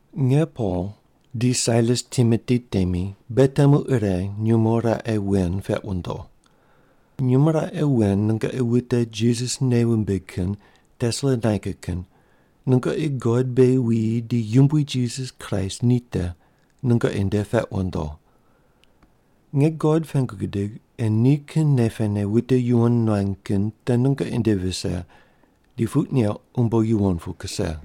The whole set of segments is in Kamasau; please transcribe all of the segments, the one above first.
Nge Pol, di Sailas Timoti temi beghi temu ire nyumo raqe wen peq wundo. Nyumo raqe wen nungoqi wute Jisas nei wumbig kin Tesalonaika kin, nungoqi God beghi wuyi di Yumbui Jisas Kraist ni te, nungoqi nde peq wundo. Nge God pengu gidig ei nikin nei pene wute yuwon nuany kin te nungoqi nde vise di puq neuq umbo yuwon pu kuse.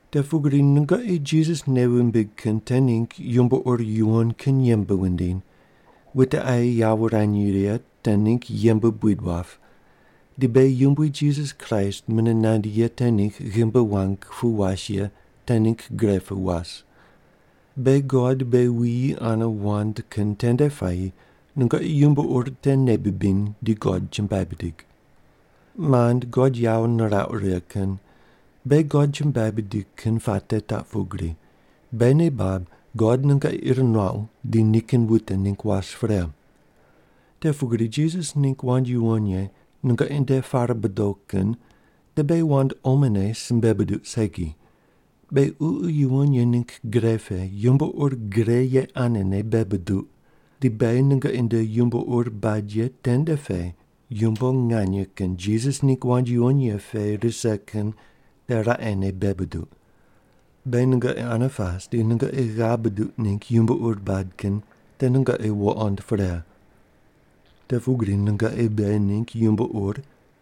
Te pugri nungoqi Jisas nei wumbig kin te ningg yumbo ur yuwon kin yembe wundiny, wute aye yawo wurany righe ye te ningg yembe buid wap, di beghi Yumbui Jisas Kraist mune nandi ye te ningg ghimbi wang pu was ye te ningg gre pu was. Beghi God beghi wuyi ane wand kin tende puayi nungoqi yumbo ur te nei bibiny di God chumbuai bidig. Mand God yawo nirauq righe kin, beghi God chumbuai bidig kin puate taq pugri, beghi nei bab God nungoqi ir nuaqu di nikin wute ningg was pre. Te pugri Jisas ningg wand yuwon ye nungoqi nde pare bodo kin te beghi wand omone simbe buduq segi, beghi Ququ Yuwon Ye ningg gre pe yumbo ur gre ye anene bei buduq, di beghi nungoqi nde yumbo ur bad ye tende pe yumbo nganye kin Jisas ningg wand yuwon ye pe rise kin te raqene bei buduq. Beghi nungoqi ane pas di nungoqi ghav buduq ningg yumbo ur bad kin te nungoqi wuqond pre. Te pugri nungoqi beghi ningg yumbo ur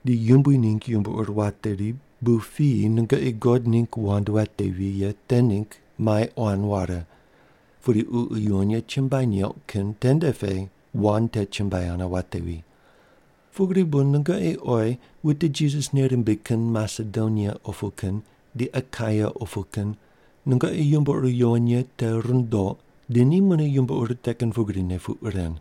di Yumbui ningg yumbo ur wateri bu piyi nungoqi God ningg wand watevi ye te ningg mai quan ware pudi Ququ Yuwon Ye chumbuai neuq kin tende pe wand te chumbuai ane watevi. Pugri bu nungoqi oyi wute Jisas nei rimbig kin Masedonia opu kin di Akaia opu kin nungoqi yumbo ur yuwon ye te rundouq di ni mune yumbo ur te kin pugrine puq ren.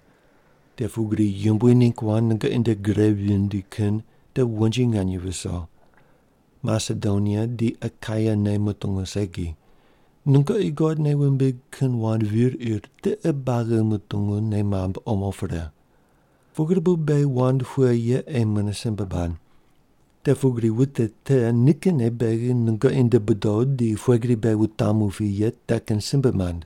Te pugri Yumbui ningg wand nungoqi nde gri vindi kin te wonji nganye viso. Masedonia di Akaia ne mutungu segi, nungoqi God nei wumbig kin wand vir ir tiqe buagi mutungu nei mamb omo pre. Pugri bu beghi wand pughe ye ei mune simbe bad. Te pugri wute te nikinne beghi nungoqi nde bodo di pughe gri beghi wutamu pi ye te kin simbe mand.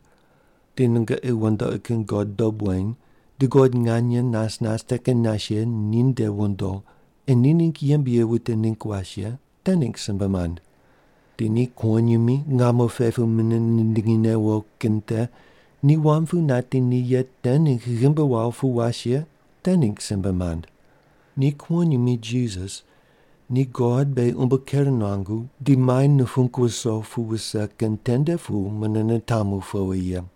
Di nungoqi wandoqi kin god dob weny di God nganye nas nas te kin nas ye ni nde wondo ei ni ningg yembe ye wute ningg was ye te ningg simbe mand. Di ni kuwonyimi, ngamo pe pu mune nindingi newo kin te, ni wam pu nati ni ye te ningg ghimbi wawo pu was ye te ningg simbe mand. Ni kuwonyimi Jisas ni God beghi umbo ker nuangu di mai nupung wuso pu wuse kin tende pu mune nitamu powi ye.